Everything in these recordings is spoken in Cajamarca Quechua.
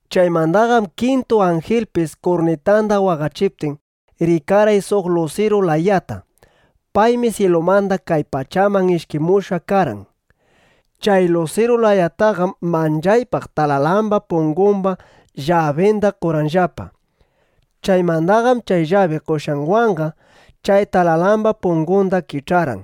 Chaymandaqam kintu anjilpis kurnitanda waqachiptin, rikarqay suq lusiru layata. Paymi syilumanda kay pachaman ishkimushqa karqan. Chay lusiru layataqam manchaypaq talalamba pungumba llabinda qorqanllapa. Chaymandaqam chay llabi qoshqanwanqa chay talalamba pungunda kich'arqan.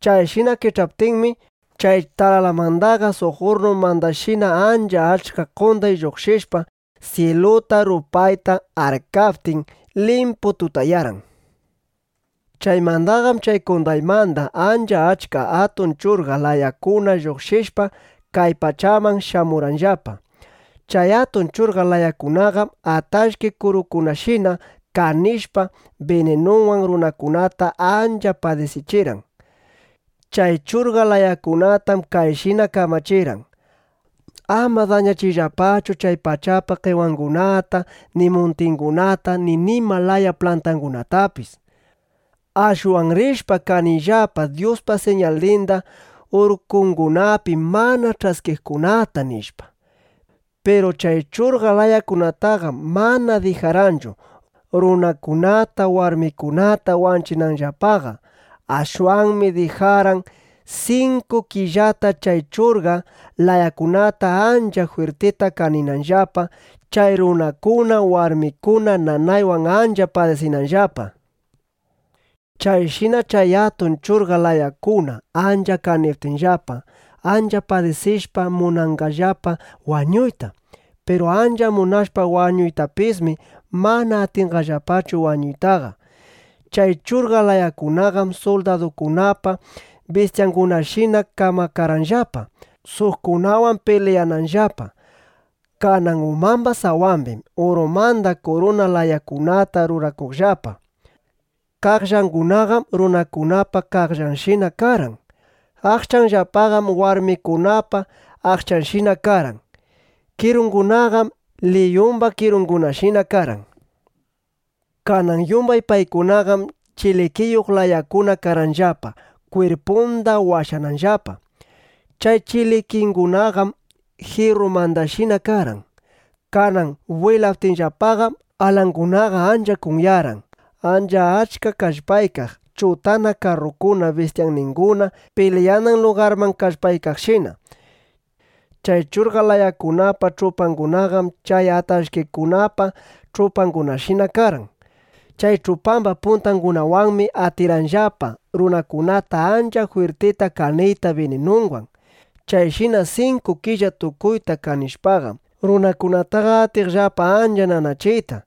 Chayshina kich'aptinmi, chay talalanmandaqa suq urrnumandashina ancha achka qonday lluqshishpa, syiluta, rupayta arkaptin, limpu tutayarqan. Chaymandaqam chay qondaymanda ancha achka atun churqap (churqa) layakuna lluqshishpa, kay pachaman shamurqanllapa. Chay atun churqa layakunaqam atallki kurukunashina kanishpa, bininunwan runakunata ancha padisichirqan. Chay churqap layakunatam kayshina kamachirqan: —Ama dañachiyllapachu chay pachapa qewangunata ni muntingunata ni nima laya plantangunatapis. Ashwan rishpa, kaniyllapa Dyuspa siñalninda urkungunapi mana ch'askiqkunata, nishpa. Piru chay churqa layakunataqam mana dijarqanchu, runakunata warmikunata wanchinanllapaqa. Ashwanmi dijarqan, sinku killata chay churqap layakuna ancha jwirtita kaninanllapa, chay runakuna, warmikuna nanaywan ancha padisinanllapa. Chayshina chay atun churqa layakuna ancha kaniptinllapam, ancha padisishpa, munanqallapa wañuyta. Piru ancha munashpa wañuytapismi, mana atinqallapachu wañuytaqa. Chay churqap layakunaqam suldadukunapa bistyangunashina kamakarqanllapa, suqkunawan pilyananllapa. Kanan umamba sawambim urumanda kuruna layakunata rurakuqllapa. Qaqllangunaqam runakunapa qaqllanshina karqan. Aqchanllapaqam warmikunapa aqchanshina karqan. Kirungunaqam liyumba kirungunashina karqan. Kanan yumbay paykunaqam chilikiyuq layakuna karqanllapa, kwirpunda washananllapa. Chay chilikingunaqam jirrumandashina karqan. Kanan bwilaptinllapaqam, alangunaqa ancha kunyarqan, ancha achka kallpaykaq chutana karrukuna bistyandinguna pilyanan lugarman kallpaykaqshina. Chay churqa layakunapa ch'upangunaqam chay atallkikunapa (alakran kurukunapa) ch'upangunashina karqan. Chay ch'upamba puntangunawanmi atirqanllapa runakunata ancha jwirtita kaniyta bininunwan. Chayshina sinku killa tukuyta kanishpaqam, runakunataqa atiqllapa ancha nanachiyta.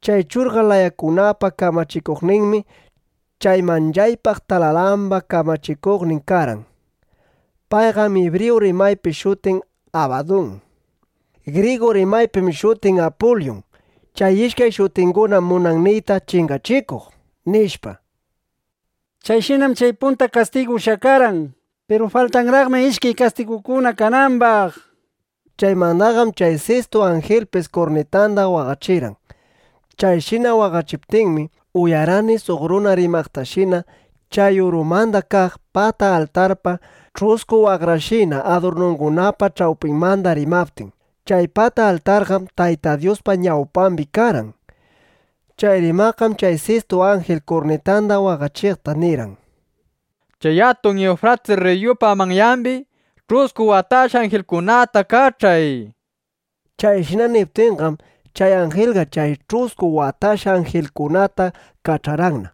Chay churqap layakunapa kamachikuqninmi chay manchaypaq talalamba kamachikuqnin karqan. Payqam ibriyu rimaypi shutin Abadun. Grigu rimaypim shutin Apulyun. Chay ishkay shutingunam munan niyta “Chingachikuq”, nishpa. Chayshinam chay punta kastigu ushyakarqan. Piru faltanraqmi ishkay kastigukuna kanambaq. Chaymandaqam chay sistu anjilpis kurnitanda waqachirqan. Chayshina waqachiptinmi, uyarqani suq runa rimaqtashina chay urumanda kaq pata altarpa ch'usku waqrashina adurnungunapa ch'awpinmanda rimaptin. Chay pata altarqam Tayta Dyuspa ñawpambi karqan. Chay rimaqqam chay sistu anjil kurnitanda waqachiqta nirqan: —Chay atun Iwfratis rriyupa manyambi ch'usku watashqa anjilkunata kach'ay, nishpa. Chayshina niptinqam, chay anjilqa chay ch'usku watashqa anjilkunata kach'arqanna.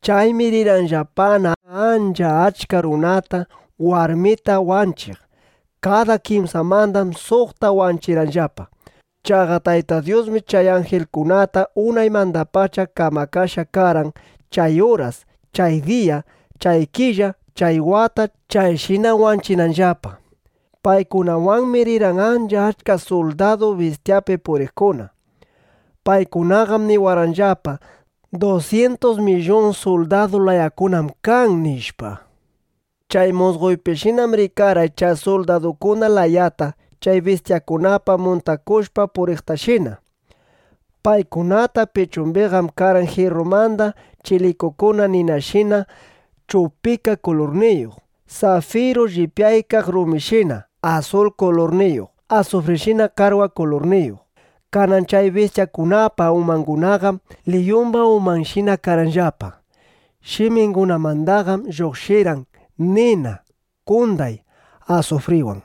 Chaymi rirqanllapana ancha achka runata, warmita wanchiq. Kada kimsamandam suqta wanchirqanllapa. Chaqa Tayta Dyusmi chay anjilkunata unaymandapacha kamakashqa karqan, chay uras, chay diya, chay killa, chay wata chayshina wanchinanllapa. Paykunawanmi rirqan ancha achka suldadu bistyapi puriqkuna. Paykunaqam niwarqanllapa: —Dusyintus millun suldadu layakunam kan, nishpa. Chay musqoypishinam rikarqay chay suldadukuna layata chay bistyakunata muntakushpa puriqtashina. Paykunapa pichumbiqam karqan jirrumanda chilikikuna ninashina chupika kulurniyuq, safiru llipyaykaq rumishina asul kulurniyuq, asufrishina qarwa kulurniyuq. Kanan chay bistyakunapa umangunaqam liyumba umanshina karqanllapa. Shimingunamandaqam lluqshirqan nina, qonday, asufriwan.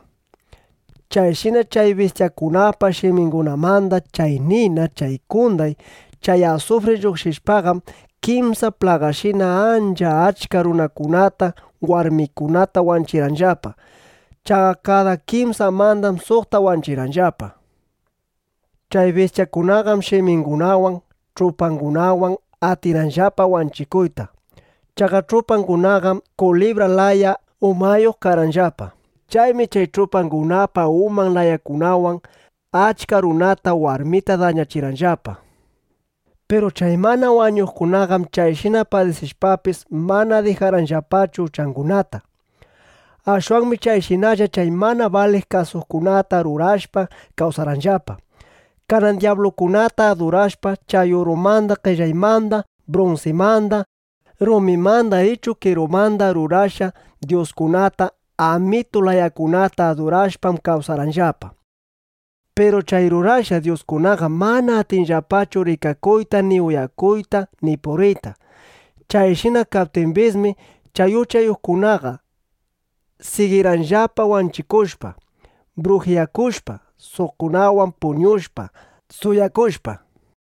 Chayshina chay bistyakunapa shimingunamanda chay nina, chay qonday, chay asufri lluqshishpaqam, kimsa plagashina ancha achka runakunata, warmikunata wanchirqanllapa. Chaqa kada kimsamandam suqta wanchirqanllapa. Chay bistyakunaqam shimingunawan, ch'upangunawan atirqanllapa wanchikuyta. Chaqa ch'upangunaqam kulibra laya umayuq karqanllapa. Chaymi chay ch'upangunapa uman layakunawan achka runata, warmita dañachirqanllapa. Piru chay mana wañuqkunaqam chayshina padisishpapis, mana dijarqanllapachu uchangunata. Ashwanmi chayshinalla chay mana baliq kusaskunata rurashpa kawsarqanllapa. Kanan dyablukunata adurashpa, chay urumanda, qellaymanda, brunsimanda, rumimanda ichu qerumanda rurashqa dyuskunata amitu layakunata adurashpam kawsarqanllapa. Piru chay rurashqa dyuskunaqam mana atinllapachu rikakuyta ni uyakuyta ni puriyta. Chayshina kaptimbismi, chay uchayuqkunaqa sigirqanllapa wanchikushpa, brujiyakushpa, suqkunawan puñushpa, suwakushpa.